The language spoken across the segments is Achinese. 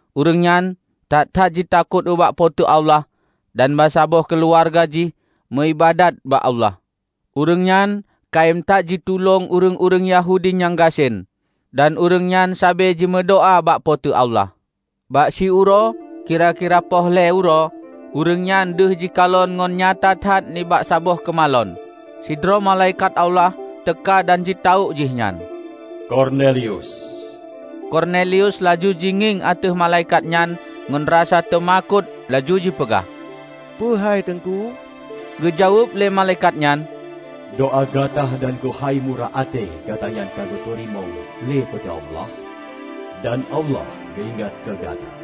Ureuëng nyan that-that jitakot ubak Po teu Allah dan bansaboh keuluwarga jih meuiébadat bak Allah. Ureuëng nyan kayém that jitulông ureuëng-ureuëng Yahudi nyang gasien, dan ureuëng nyan sabe jimeudoá bak Po teu Allah. Bak siuroe kira-kira poh lhée uroe ureuëng nyan deuh jikalon ngon nyata that nibak saboh keumalon, sidroe malaikat Allah teuka dan jitawök jih nyan, "Kornelius!" Kornelius laju jingieng ateueh malaikat nyan ngon rasa teumakot laju jipeugah, "Peue hai Teungku?" Geujaweueb lé malaikat nyan, "Doá gata dan keuhai murah até gatanyan ka geuteurimong lé Po teu Allah dan Allah geuingat keu gata.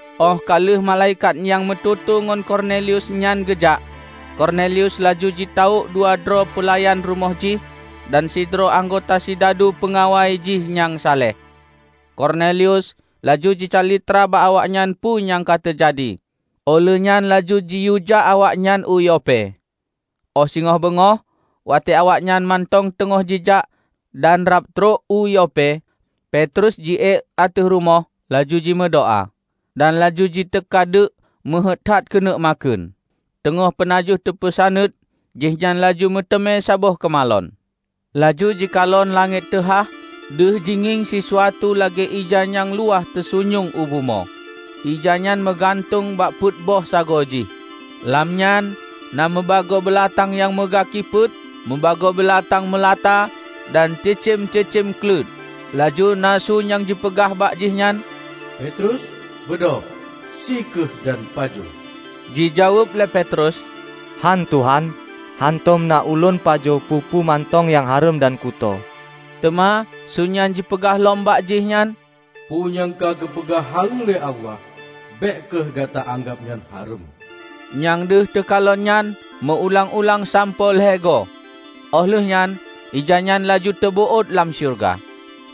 Óh ka lheueh malaikat nyang meututoe ngon Kornelius nyan geujak, Kornelius laju jitawök dua droe peulayan rumoh jih dan sidroe anggota sidadu peungawai jih nyang saleh. Kornelius laju jicalitra bak awaknyan peue nyang ka teujadi, óh lheuehnyan laju jiyuejak awaknyan u Yope. Óh singoh beungoh, watée awaknyan mantong teungoh jijak dan rab trok u Yope, Petrus jiék ateueh rumoh laju jimeudoá. Dan laju jiteuka deuk meuheuét that keuneuk makheun. Teungoh peunajoh teupeusaneut, jihnyan laju meuteumé saboh keumalon. Laju jikalon langét teuhah deuh jingieng sisuatu lagée ija nyang luwah teusunyueng u bumoe, ijanyan meugantueng bak peuet boh sagoe jih. Lam nyan na mubagoe beulatang nyang meugaki peuet, mubagoe beulatang meulata dan cicém-cicém kleuet. Laju na su nyang jipeugah bak jihnyan, "Petrus, beudôh, sie kheueh dan pajoh!" Jijaweueb lé Petrus, "Hán, Tuhan! Hántom na ulôn pajoh peue-peue mantong nyang hareuem dan kuto." Teuma su nyan jipeugah lom bak jih nyan, "Peue nyang ka geupeugah haleue lé Allah, bék kheueh gata anggab nyan hareuem." Nyang deuh teukalon nyan meu-ulang-ulang sampoe lhée goe, óh lheueh nyan ijanyan laju teubeuôt lam syeuruga.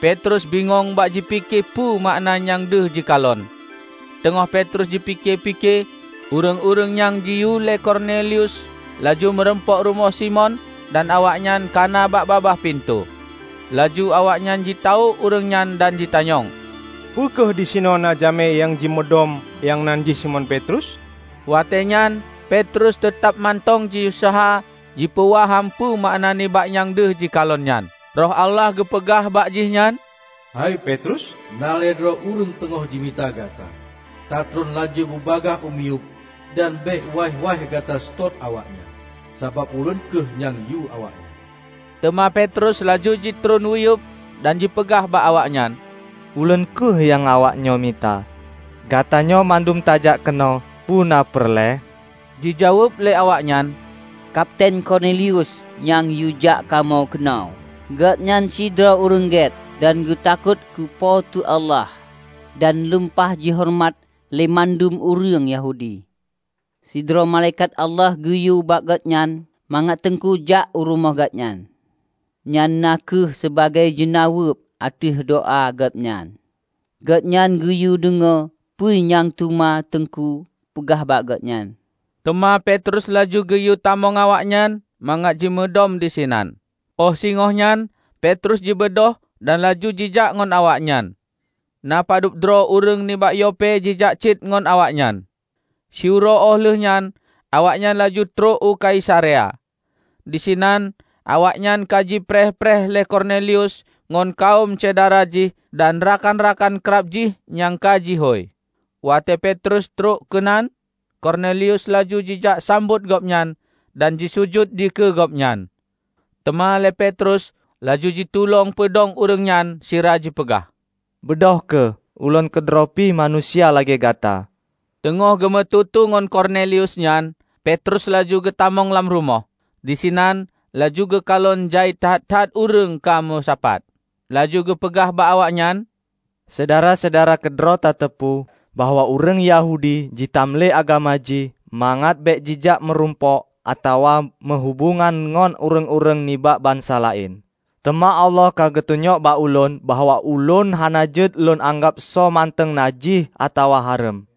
Petrus bingong bak jipike peue makna nyang deuh jikalon. Teungoh Petrus jipike-pike, ureuëng-ureuëng nyang jiyue lé Kornelius laju meurumpok rumoh Simon dan awaknyan kana bak babah pintoe. Laju awaknyan jitawök ureuëng nyan dan jitanyong, "Peu kheueh disinoe na jamé nyang jimudom, nyang nan jih Simon Petrus?" Watée nyan Petrus teutab mantong jiuseuha jipeuwaham peu makna nibak nyang deuh jikalon nyan, Roh Allah geupeugah bak jihnyan, "Hai Petrus, na lhée droe ureuëng teungoh jimita gata. Ta treun laju bubagaih u miyueb dan bék waih-waih gata seutôt awaknyan, sabab Ulôn kheueh nyang yua awaknyan." Teuma Petrus laju jitreun uyueb dan jipeugah bak awaknyan, "Ulôn kheueh nyang awaknyoe mita. Gatanyoe mandum tajak keunoe peuna peureulée?" Jijaweueb lé awaknyan, "Kapiten Kornelius nyang yuejak kamoe keunoe. Gobnyan sidroe ureuëng gét dan geutakot keu Po teu Allah, dan lumpah jihoreumat lé mandum ureuëng Yahudi. Sidroe malaikat Allah geuyue bak gobnyan mangat Teungku jak u rumoh gobnyan, nyan na kheueh sibagoe jeunaweueb ateueh doá gobnyan, gobnyan geuyue deungoe peue nyang teuma Teungku peugah bak gobnyan." Teuma Petrus laju geuyue tamong awaknyan mangat jimudom disinan. Óh singoh nyan Petrus jibeudôh dan laju jijak ngon awaknyan. Na padub droe ureuëng nibak Yope jijak cit ngon awaknyan. Siuroe óh lheueh nyan awaknyan laju trok u Kaisarea. Disinan awaknyan ka jipreh-preh lé Kornelius ngon kawöm syedara jih dan rakan-rakan krab jih nyang ka jihôi. Watée Petrus trok keunan. Kornelius laju jijak sambot gobnyan dan jisujut dikeue gobnyan. Teuma lé Petrus laju jitulông peudong ureuëng nyan, sira jipeugah, "Beudôh kheueh! Ulôn keudroe pih manusia lagée gata." Teungoh geumeututoe ngon Kornelius nyan, Petrus laju geutamong lam rumoh. Disinan laju geukalon jai that-that ureuëng ka meusapat. Laju geupeugah bak awaknyan, "Syedara-syedara keudroe tateupeue bahwa ureuëng Yahudi jitam lé agama jih mangat bék jijak meurumpok atawa meuhubongan ngon ureuëng-ureuëng nibak bansa laén. Teuma Allah ka geutunyok bak ulôn bahwa ulôn hana jeuet lôn anggab soe mantong najih atawa hareuem.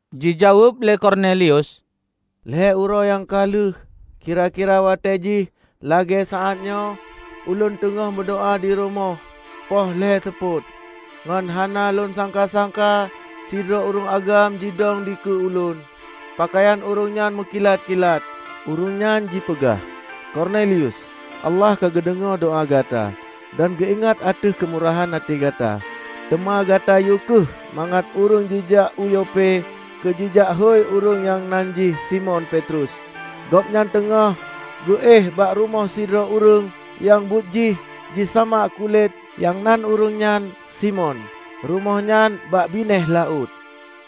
Jijaweueb lé Kornelius, "Lhée uroe nyang ka lheueh, kira-kira watée jih lagée saát nyoe, ulôn teungoh meudoá dirumoh poh lhée seupôt. Ngon hana lôn sangka-sangka sidroe ureuëng agam jidong dikeue ulôn. Peukayan ureuëng nyan meukilat-kilat. Ureuëng nyan jipeugah, 'Kornelius! Allah ka geudeungoe doá gata dan geuingat ateueh keumurahan até gata. Teuma gata yue kheueh mangat ureuëng jijak u Yope keu jijak hôi ureuëng nyang nan jih Simon Petrus. Gobnyan teungoh geu éh bak rumoh sidroe ureuëng nyang buet jih jisamak kulét nyang nan ureuëng nyan Simon; rumoh nyan bak binéh laôt.'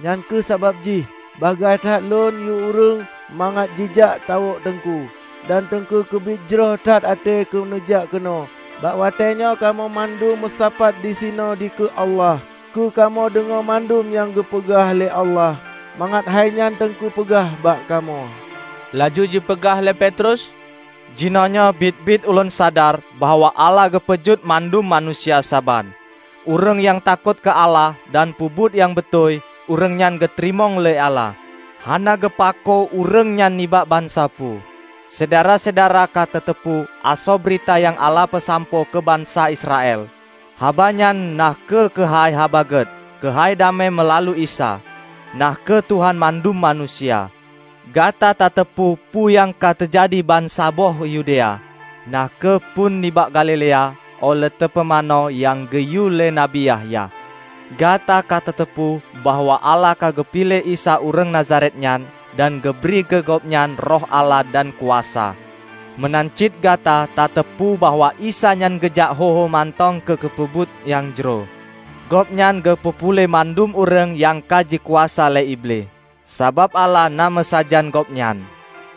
Nyang kheueh sabab jih bagaih that lôn yue ureuëng mangat jijak tawök Teungku. Dan Teungku keubiet jroh that até keu neujak keunoe bak watée nyoe kamoe mandum meusapat disinoe dikeue Allah keu kamoe deungoe mandum nyang geupeugah lé Allah mangat hai nyan Teungku peugah bak kamoe." Laju jipeugah lé Petrus, "Jinoenyoe biet-biet ulôn sadar bahwa Allah geupeujeuet mandum manusia saban. Ureuëng nyang takot keu Allah dan peubuet nyang beutôi, ureuëng nyan geuteurimong lé Allah, hana geupakoe ureuëng nyan nibak bansa peue. Syedara-syedara ka tateupeue asoe beurita nyang Allah peusampoe keu bansa Israel. Habanyan na kheueh keuhai Haba Gét keuhai damé meulalu Isa, na kheueh Tuhan mandum manusia. Gata tateupeue peue nyang ka teujadi bansaboh Yudea, na kheueh phon nibak Galilea óh lheueh teupeumanö nyang geuyue lé Nabi Yahya. Gata ka tateupeue bahwa Allah ka geupiléh Isa ureuëng Nazaret nyan dan geubri keu Gobnyan Roh Allah dan kuasa. Meunan cit gata tateupeue bahwa Isa nyan geujak ho-ho mantong keu geupeubuet nyang jroh; Gobnyan geupeu puléh mandum ureuëng nyang ka jikuasa lé Iblih. Sabab Allah na meusajan Gobnyan.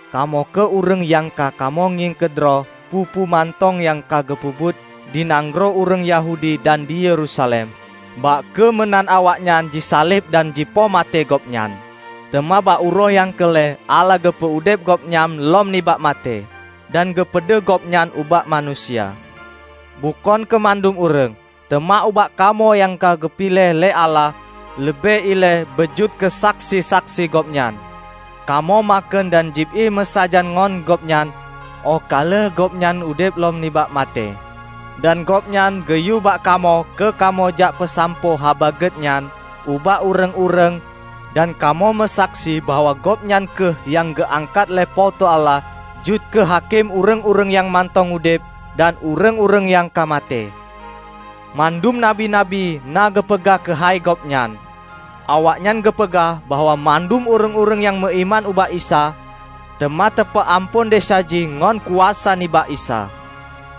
Kamoenyoe kheueh ureuëng nyang ka kamoe ngieng keudroe peue-peue mantong nyang ka geupeubuet di nanggroe ureuëng Yahudi dan di Yerusalem. Bah kheueh meunan awaknyan jisaleb dan jipoh maté Gobnyan. Teuma bak uroe nyang keu lhée Allah geupeu udeb Gobnyan lom nibak maté dan geupeudeuh Gobnyan ubak manusia; bukon keu mandum ureuëng, teuma ubak kamoe nyang ka geupiléh lé Allah leubeh ilée beu jeuet keusaksi-saksi Gobnyan. Kamoe makheun dan jieb ié meusajan ngon Gobnyan óh ka lheueh Gobnyan udeb lom nibak maté. Dan Gobnyan geuyue bak kamoe keu kamoe jak peusampoe Haba Gét nyan ubak ureuëng-ureuëng dan kamoe meusaksi bahwa Gobnyan kheueh nyang geuangkat lé Po teu Allah jeuet keu hakém ureuëng-ureuëng nyang mantong udeb dan ureuëng-ureuëng nyang ka maté. Mandum nabi-nabi na geupeugah keuhai Gobnyan. Awaknyan geupeugah bahwa mandum ureuëng nyang meuiman ubak Isa, teuma teupeuamphon desya jih ngon kuasa nibak Isa."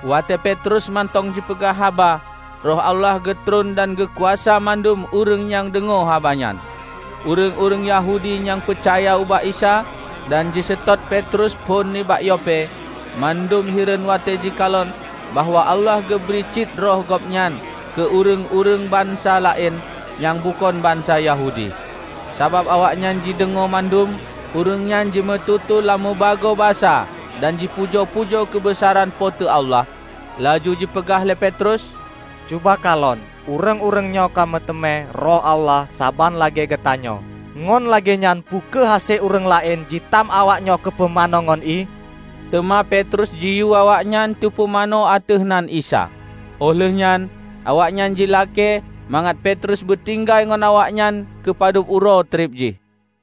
Watée Petrus mantong jipeugah haba, Roh Allah geutreun dan geukuasa mandum ureuëng nyang deungoe haba nyan. Ureuëng-ureuëng Yahudi nyang peucaya ubak Isa dan jiseutôt Petrus phon nibak Yope, mandum hireuen watée jikalon bahwa Allah geubri cit Roh Gobnyan keu ureuëng-ureuëng bansa laén nyang bukon bansa Yahudi. Sabab awaknyan jideungoe mandum ureuëng nyan jimututoe lam mubagoe basa dan jipujoe-pujoe keubeusaran Po teu Allah. Laju jipeugah lé Petrus, "Cuba kalon, ureuëng-ureuëng nyoe ka meuteumé Roh Allah saban lagée geutanyoe. Ngon lagée nyan peu kheueh hase ureuëng laén jitam awaknyoe keu teupumanö ngon ié?" Teuma Petrus jiyue awaknyan teupumanö ateueh nan Isa. Óh lheueh nyan awaknyan jilakée mangat Petrus beutinggai ngon awaknyan keu padub uroe treb jih.